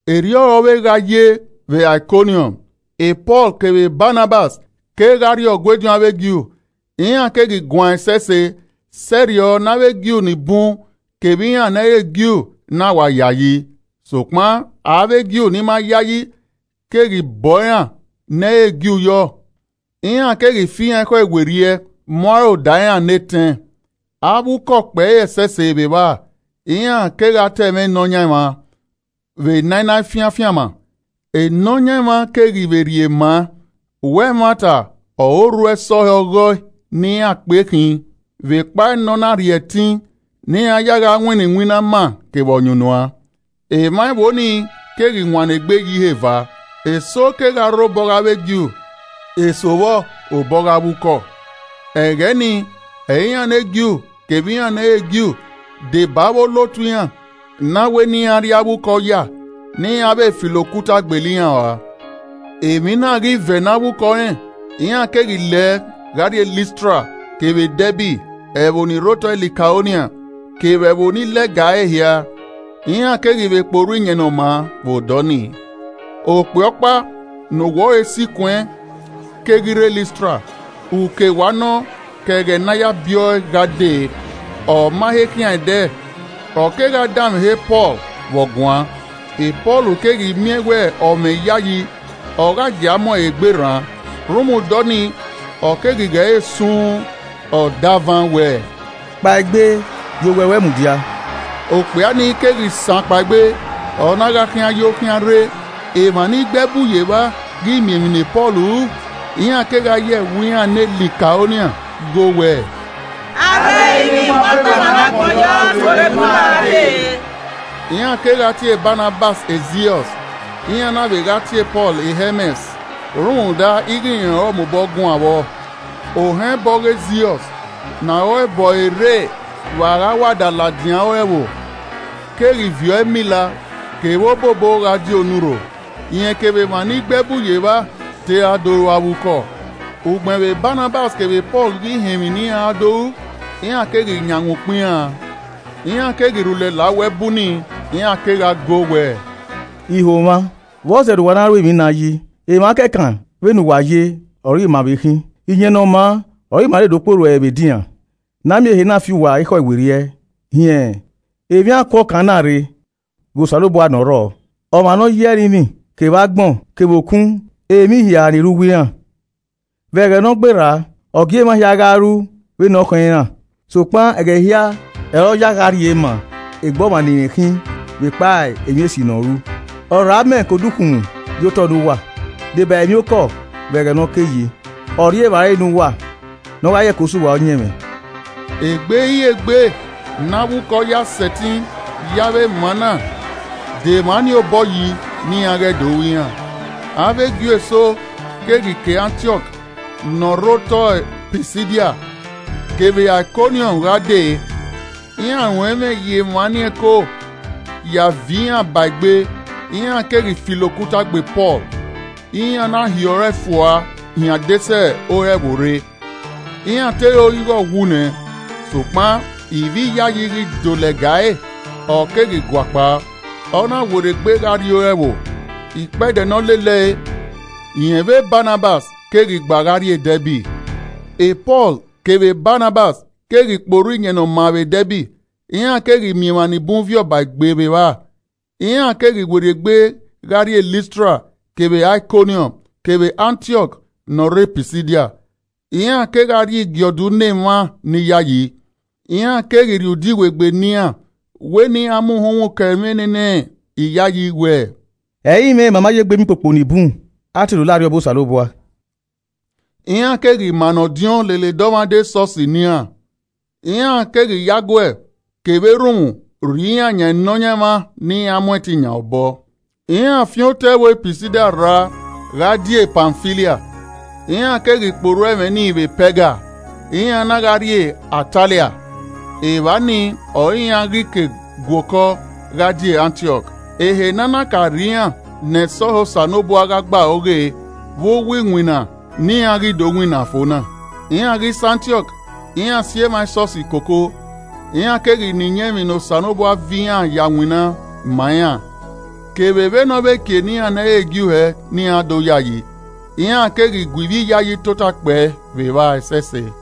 Erriọ ọre ọ vbe gha ye vbe Aikọniọm, Pọl kevbe Banabas kegha rrie Ọgua ediọn avbe Ju, iran keghi guan ẹsẹse, sẹrriọ ne avbe Ju ni bun kevbe iran ne ẹ i re Ju na wa yayi. Sokpan avbe Ju ni ma yayi keghi bọ iran ne ẹ i re Ju yọ, iran keghi fi iran ekhọe werriẹ mu aro da iran ne etẹn. Avbe ukọ kpẹre ẹsẹse vbe evba, iran kegha ta ẹmwẹ Nọyaẹnmwa vbe ne a na fian afianma, Nọyaẹnmwa keghi vbe rhie maa wẹ ẹmwata ọre orhu ẹsọhẹ ọghe ẹe ne iran kpe khin vbe ekpa ne ọ na rhie ẹtin ne iran ya gha winna iwinna ama kevbe ọyunnuan. Emwa ẹvbo ni keghi wannọ egbe ye ihe eva, eso kegha rre obọ ọghe avbe Ju, eso vbọ, obọ ọghe avbe ukọ. Ẹghẹ nii ọre iran ne Ju kevbe iran ne ẹ i re Ju, deba avbe olotu iran, na wẹ ne iran rri avbe ukọ oya ne iran vbe filo okuta gbele iran uan. Emwi na ghi vẹ ne avbe ukọ rẹn, iran keghi lẹ gha rrie Listra kevbe Dẹbi, ẹvbo ni rre otọ Likaonia, kevbe ẹvbo ni lẹga ẹre hia. Iran keghi vbe kpe orhu Iyẹn Ne ọ maa vbe odọ nii. Okpia ọkpa ne owẹ ọre sikuẹn keghi rre Listra, uke wa nọ ke ẹghẹ ne a ya biẹ ọe gha dee, ọ ma he khian ẹdẹ. Ọ kegha danmwehọ e Pọl vbe ọ guan. Pọl keghi miẹn wẹ ọ mwẹ iyayi, ọ gha gie a mu ẹre egbe rran, rhunmwuda ọnii, ọ keghi ghe ẹre sun uun. Ọ davan wẹẹ, “Kpaegbe ye owẹ ruẹ mudia!” Okpia ni keghi san kpaegbe, ọ na gha khian yo khian re. Emwa ni gbe ẹbu ye evba ghi miẹn emwi ne Pọl ru, iran kegha ye ẹvbo iran ne Likaonia go wẹẹ, “Avbe ẹrinmwi mu akpa emwa ne agbọn yọ tuorre bu ima gha dee!” Iran kegha tie Banabas Ziọs, iran na vbe gha tie Pọl Hẹmẹs rhunmwuda ighẹ rẹn ọre ọ mobọ guan vbọ. Ohẹn ẹbọ ọghe Ziọs, ne aro ẹbọ ẹre rre vbe a gha wa da ladian ore ẹvbo, keghi viọ ẹmila kevbe obobo gha die onurho. Rẹn kevbe emwa ni gbe ẹbu ye evba te ra do ru avbe ukọ. Ugbẹn vbe Banabas kevbe Pọl ghi họn emwi ne iran ra do ru, iran keghi yanghan ukpọn iran an, iran keghi rhulẹ la uwu ẹbu nii, iran kegha goo wẹẹ, “Iho mwa, vbọzẹ ne uwa na ru emwi na yi? Emwa kẹkan vbe ne uwa ye ọre ima vbe khin. Iyẹn Ne ọ maa ọre ima rre do kpe orhu ẹre vbe edinran, ne a miẹn ehe na fi uwa ekhọe werriẹ hin emwi akuọkan na rre ghe Osanobua ne ọ rrọọ, ọmwa ne ọ yi ẹrinmwi kevbe agbọn kevbe okun kevbe emwi hia ni rre uwu iran. Vbe ẹghẹ ne ọ gberra, ọ gie emwa hia gha ru vbene ọ khọn iran. Sokpan ẹghẹ hia ọre ọ ya gha rhie maa egbe ọmwa ne irẹn khin vbekpa emwi esi ne ọ ru. Ọ rhọ amẹ ke odukhunmwu ye otọ ne uwa, deba emwiokọ vbe ẹghẹ ne ọ ke yi, ọ rhie evbare ne uwa ne ọ gha ye ẹko sẹ uwa ọyẹnmwẹ.” Egbe i re egbe ne avbe ukọ ya sẹtin ye avbe ẹmwẹ na da emwa nii obọ yi ne iran ghẹ do ru iran. Avbe Ju eso keghi ke Antiọk ne ọ rre otọ Pisidia kevbe Aikọniọm gha dee, iran ruẹn ẹmwẹ ye emwa nii ẹko ya viọ iran ba egbe, iran keghi filo okuta gbe Pọl, iran na hiọrọ ẹe fua hin adesẹ ore ẹvbo rre, iran te ro ighẹ ọ wu nẹ. Sokpan ivbi iyayi ghi do lẹga ẹre, ọ keghi guakpao, ọ na werriegbe gha rrie ore ẹvbo. Ikpẹdẹ ne ọ lele ẹe, rẹn vbe Banabas keghi gba gha rrie Dẹbi. Pọl kevbe Banabas keghi kpe orhu Iyẹn Ne ọ maa vbe Dẹbi, iran keghi miẹn emwa ni bun viọ ba egbe vbe evba. Iran keghi werriegbe gha rrie Listra kevbe Aikọniọm kevbe Antiọk ne ọ rre Pisidia. Iran kegha rhie igiẹdu ne emwa ni yayi, iran keghi rhie ude iwegbe ne iran wẹ ne iran mu uhunmwu kọ ẹmwẹ nene iyayi wẹ, “Ẹ i mwẹ ma ma ye egbe miẹn ukpokpo ni bun a te do la Arriọba Osanobua!” Iran keghi mannọ ọdiọn lele dọmwadẹ esọsi ne iran. Iran keghi ye aguẹ kevbe erhunmwu rhie iran yan Nọyaẹnmwa ne iran mu ẹtin yan obọ. Iran fian otọe ẹvbo Paisidia rra gha die Pamfilia. Iran keghi kpe orhu ẹmwẹ ni vbe Pẹga, iran na gha rrie Atalia. Evba nii i ọre iran ghi ke gua okọ gha die Antiọk, ehe ne a na ka rhie iran ne ẹsọhẹ Osanobua gha gbe aro ghe vbe uwu iwinna ne iran ghi do winna fo na. Iran ghi sẹ Antiọk, iran si emwa esọsi koko, iran keghi na iyẹn emwi ne Osanobua viọ iran ya winna ma iran kevbe vbene ọ vbe kie ne iran ne ẹ i re Ju hẹ ne iran do yayi. Iran keghi gu ivbi iyayi tota kpẹe vbe evba ẹsẹse.